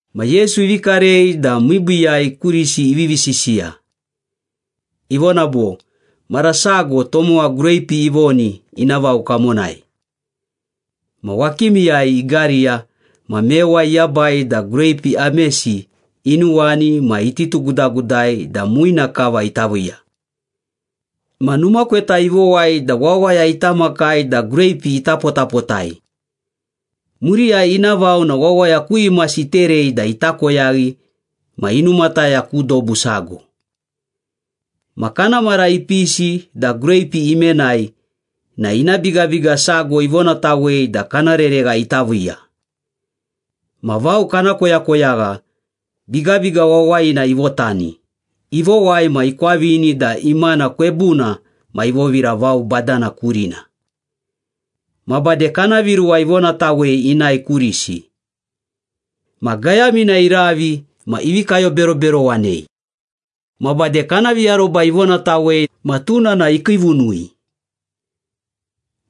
Ma Yesu ivi karei da miibiiyai kurisi ivivi sisiya. Ivona bo, “Mara sago tomowa greipi ivoni ina vao kamonai. Ma wakimiyai igariya ma mewa iyabai da greipi amesi inuwani ma ititugudagudai da muina kava ita viiya. Ma numa kweta ivowai da wawaya ita makai da greipi ita potapotai. Muriyai ina vao na wawaya ku imasi iterei da ita koyaghi ma inumataya ku dobu sago. Ma kana mara ipisi da greipi imenai na ina bigabiga sago ivonatawei da kana reregha ita viiya. Ma vao kana koyakoyagha, bigabiga wawayina ivotani, ivowai ma ikwavini da imana kwebuna ma ivovira vao badana kurina. Ma bade kana viruwa ivonatawei inae kurisi. Ma gayamina iravi ma ivi kayoberoberowanei. Ma bade kana viaroba ivonatawei ma tuna na ikiivunui.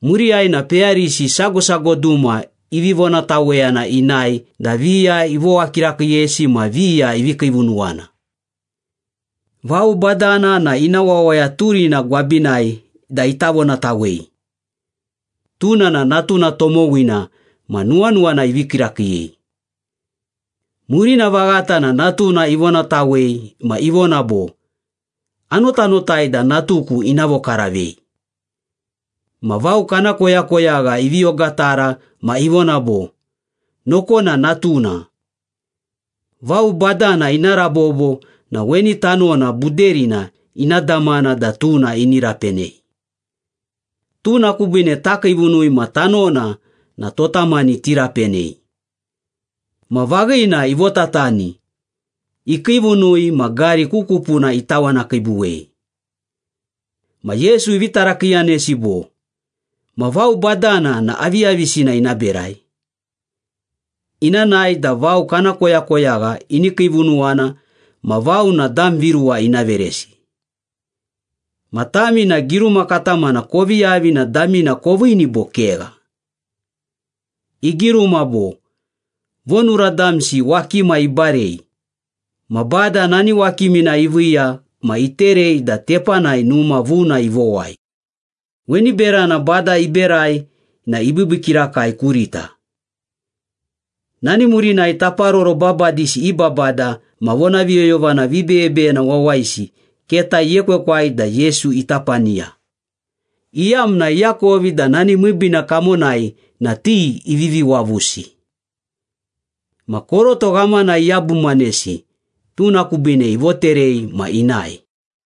Muriyai na peyarisi sago sago duma ivi vonataweyana inae da viya ivowa kirakiiyesi ma viya ivi kiivunuwana. Vao badana na ina wawaya turina gwabinai da ita vonatawei. Tuna na natuna tomowina ma nuwanuwana ivii kirakiiyei. Murina vaghata na natuna ivonatawei ma ivona bo, ‘Anotanotai da natuku ina vokaravei.’ Ma vao kana koyakoyagha ivi ogatara ma ivona bo, ‘Nokona natuna. Vao badana ina rabobo na weni tanona buderina ina damana da tuna ini rapenei. Tuna kubiine takiivunui ma tanona na tota mani tirapenei.’ Ma vaghina ivotatani, ikiivunui ma gari ku kupuna itawanakiibuwei.” Ma Yesu ivi tarakiiyanesi bo, “Ma vao badana na aviyavisina ina berai? Ina nae da vao kana koyakoyagha ini kiivunuwana ma vao na dam viruwa ina veresi. Ma tami na giruma katamana kovi yavi na damina koviini bo kegha? Igiruma bo, ‘Vonura damsi wakima ibarei, Ma Bada nani wakimina iviiya ma iterei da tepanai numa vuna ivowai. Weni berana Bada iberai na ibiibii kirakai kurita.’” Nani murinai taparoro babadisi i babada ma vonaviyoyovana vibeyebeyena wawayisi keta iekwekwai da Yesu ita paniya, iyamna iakovi da nani miibiina kamonai na ti ivivi wavusi. Ma koroto ghamana iyabumanesi, tuna kubiine ivoterei ma inae.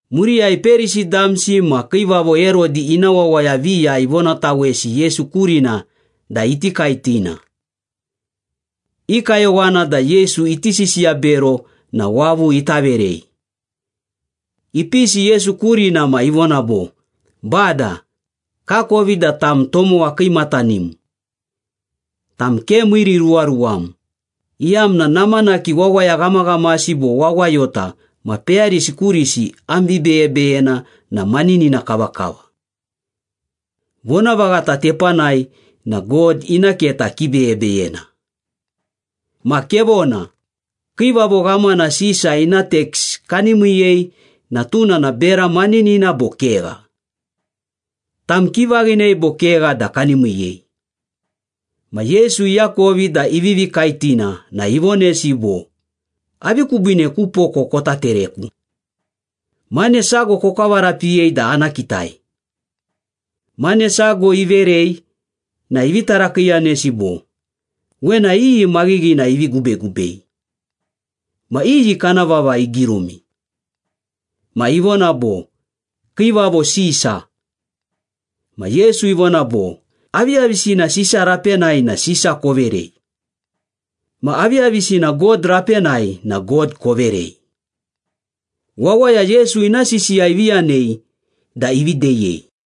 Muriyai Perisi damsi ma Kiivavo Herodi ina wawaya viya ivonatawesi Yesu kurina da iti kaetina. I kayowana da Yesu iti sisiya bero na wavu ita verei. Ipisi Yesu kurina ma ivona bo, “Bada, kakovi da tam tomowa kiimatanim. Tam ke miiriruwaruwam, iyamna namanaki wawaya ghamaghamasi bo wawayota ma peyarisi kurisi am vibeyebeyena na maninina kavakava. Vonavaghata tepanai na God ina keta kibeyebeyena. Ma kevona, Kiivavo Ghamana Sisa ina teks kani miiyei na tuna na bera maninina bo kegha? Tam kivaghinei bo kegha da kani miiyei?” Ma Yesu iakovi da ivivi kaetina na ivonesi bo, “Avi kubiine ku poko kota tereku? Mane sago kokavarapiyei da ana kitai.” Mane sago iverei na ivi tarakiiyanesi bo, “Wena iyi maghighina ivi gubegubei? Ma iyi kana vava igirumi?” Ma ivona bo, “Kiivavo Sisa.” Ma Yesu ivona bo, “Aviyavisina Sisa rapenai na Sisa koverei. Ma aviyavisina God rapenai na God koverei.” Wawaya Yesu ina sisiya ivi yanei da ivi deyei.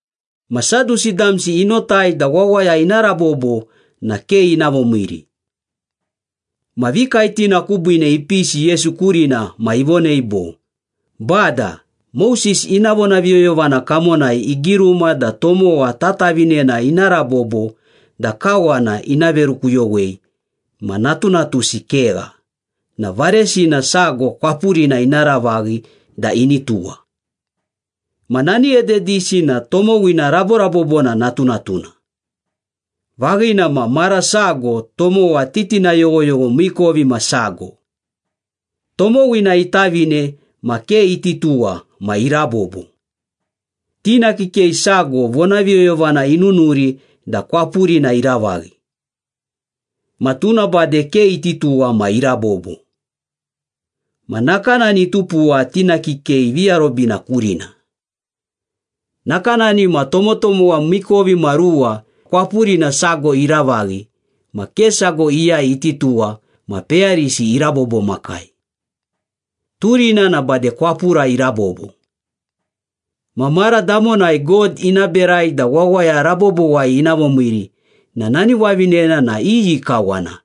Ma Sadusi damsi inotai da wawaya ina rabobo na ke ina vomiiri. Ma vikaetina kubiine ipisi Yesu kurina ma ivonei bo, “Bada, Moses ina vonaviyoyovana kamonai igiruma da tomowa tatavinena ina rabobo da kawana ina verukuyowei ma natunatusi kegha na varesina sago kwapurina ina ravaghi da ini tuwa. Ma nani ededisi na tomowina raborabobona natunatuna. Vaghina ma, mara sago tomowa titina yoghoyogho miikovimasago. Tomowina itavine ma ke iti tuwa ma irabobo. Tina kikei sago vonaviyoyovana inunuri da kwapurina iravaghi. Ma tuna bade ke iti tuwa ma irabobo. Ma nakanani itupuwa tina kikei viarobina kurina. Nakanani ma tomotomowa miikovimaruwa kwapurina sago iravaghi ma ke sago iyai iti tuwa ma peyarisi irabobomakai. Turina na bade kwapura irabobo. Ma mara damonai God ina berai da wawaya rabobowai ina vomiiri na nani wavinena na iyi kawana,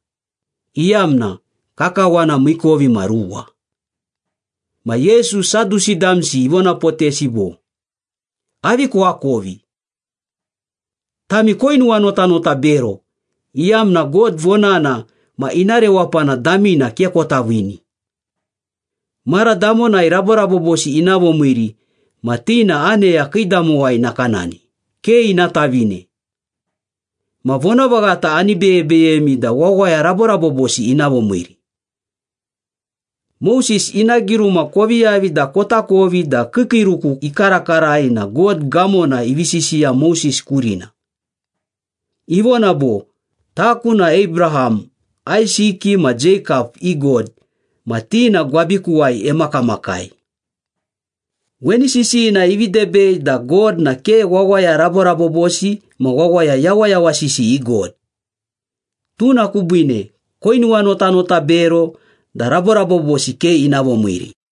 iyamna kakawana miikovimaruwa?” Ma Yesu, Sadusi damsi ivonapotesi bo, “Avi koakovi? Tami koinuwanotanota bero iyamna God vonana ma ina rewapana damina ke kota viini. Mara damonai raborabobosi ina vomiiri ma ti na aneya kiidamowai nakanani, ke ina tavine. Ma vonavaghata ani beyebeyemi da wawaya raborabobosi ina vomiiri. Moses ina giruma kovi yavi da kotakovi da kiikiiruku ikarakarai na God gamona ivi sisiya Moses kurina. Ivona bo, ‘Taku na Abraham, Aisiki ma Jeikap i God ma ti na gwabikuwai emakamakai.’ Weni sisiyina ivi debei da God na ke wawaya raborabobosi ma wawaya yawayawasisi i God. Tuna kubiine koinuwanotanota bero da raborabobosi ke ina vomiiri.”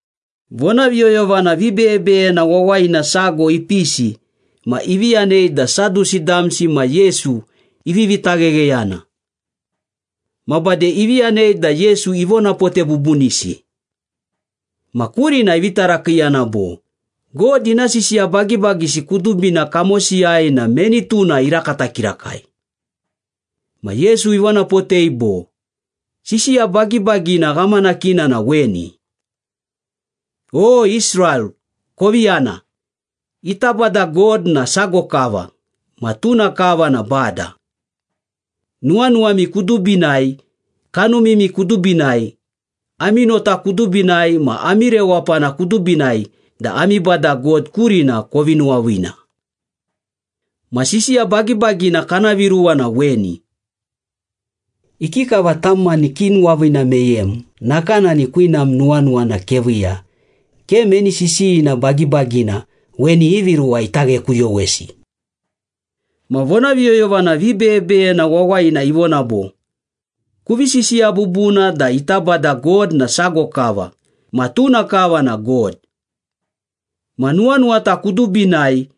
Vonaviyoyovana vibeyebeyena wawayina sago ipisi ma ivi yanei da Sadusi damsi ma Yesu ivivi taghegheyana. Ma bade ivi yanei da Yesu ivonapote bubunisi. Ma kurina ivi tarakiiyana bo, “God ina sisiya bagibagisi kudubina kamosiyai na meni tuna irakata kirakai?” Ma Yesu ivonapotei bo, “Sisiya bagibagina ghamanakina na weni. ‘O Israel kovi yana, ita Bada God na sago kava, ma tuna kava na Bada. Nuwanuwami kudubinai, kanumimi kudubinai, ami nota kudubinai ma ami rewapana kudubinai da ami Bada God kurina kovi nuwaviina.’ Ma sisiya bagibagina kana viruwa na weni. ‘Ikikava tam mani kinuwaviina meyem, nakanani kwinam nuwanuwana keviiya.’ Ke meni sisiyina bagibagina weni ivi ruwa ita ghekuyowesi.” Ma vonaviyoyovana vibeyebeyena wawayina ivona bo, “Kuvi sisiya bubuna da ita Bada God na sago kava ma tuna kava na God. Ma nuwanuwata kudubinai,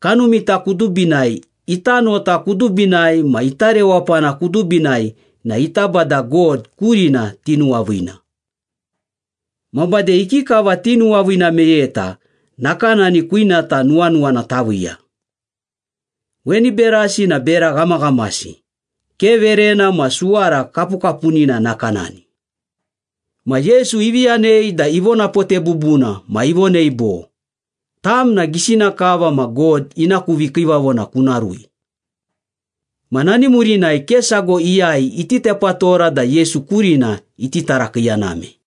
kanumita kudubinai, ita nota kudubinai ma ita rewapana kudubinai na ita Bada God kurina tinuwaviina. Ma bade ikikava tinuwaviina meyeta, nakanani kwinata nuwanuwana taviiya. Weni berasi na bera ghamaghamasi, ke verena ma suwara kapukapunina nakanani.” Ma Yesu ivi yanei da ivonapote bubuna ma ivonei bo, “Tam na gisina kava ma God ina ku vikiivavona kuna rui.” Ma nani murinai ke sago iyai iti tepatora da Yesu kurina iti tarakiiyaname.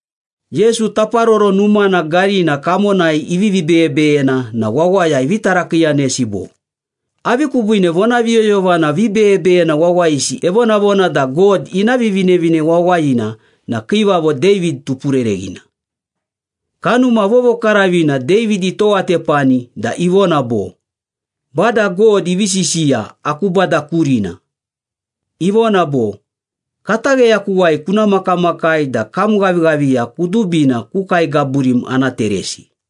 Yesu Taparoro Numana garina kamonai ivivi beyebeyena na wawaya ivi tarakiiyanesi bo, “Avi kubiine vonaviyoyovana vibeyebeyena wawayisi evonavona da God ina Vivinevine Wawayina na Kiivavo David tupurereghina? Kanuma Vovokaravina David itowatepani da ivona bo, ‘Bada God ivi sisiya aku Bada kurina. Ivona bo, Katagheyakuwai kuna makamakai da kam ghavighaviya kudubina ku kae gaburim ana teresi.’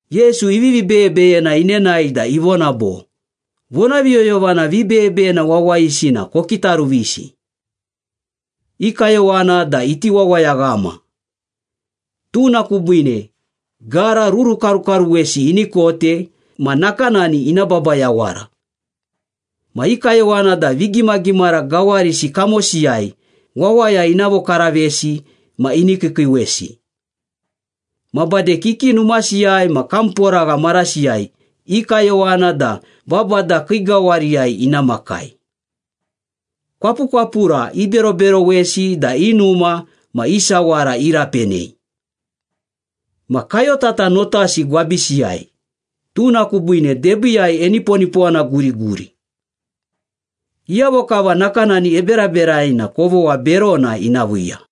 Yesu ivivi beyebeyena inenae da ivona bo, “Vonaviyoyovana vibeyebeyena wawayisi na kokitaruvisi. I kayowana da iti wawayaghama. Tuna kubiine gara rurukarukaruwesi ini kote ma nakanani ina baba yawara. Ma i kayowana da vigimagimara gawarisi kamosiyai wawaya ina vokaravesi ma ini kiikiiwesi. Ma bade kiki numasiyai ma kamporagha marasiyai i kayowana da babada kii gawariyai ina makai. Kwapukwapura iberoberowesi da i numa ma i sawara irapenei. Ma kayotata notasi gwabisiyai, tuna kubiine debiiyai eniponipowana guriguri. Iyavo kava nakanani eberaberai na kovogha berona ina viiya.”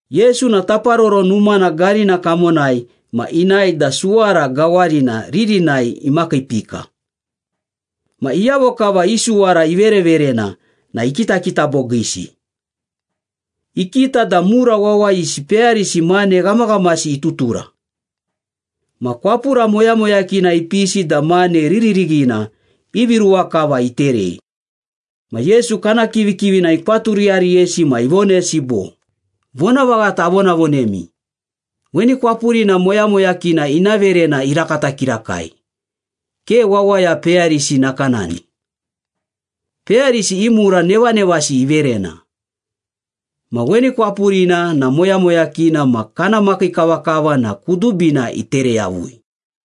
Yesu na Taparoro Numana garina kamonai ma inae da suwara gawarina ririnai imakiipika. Ma iyavo kava i suwara ivereverena na ikitakita bogiisi. Ikita da mura wawayisi peyarisi mane ghamaghamasi itutura. Ma kwapura moyamoyakina ipisi da mane riririghina ivi ruwa kava iterei. Ma Yesu kana kivikivina ikwaturiyariyesi ma ivonesi bo, “Vonavaghata avonavonemi, weni kwapurina moyamoyakina ina verena irakata kirakai, ke wawaya peyarisi nakanani. Peyarisi i mura nevanevasi iverena. Ma weni kwapurina na moyamoyakina ma kana makii kavakava na kudubina itere yavui.”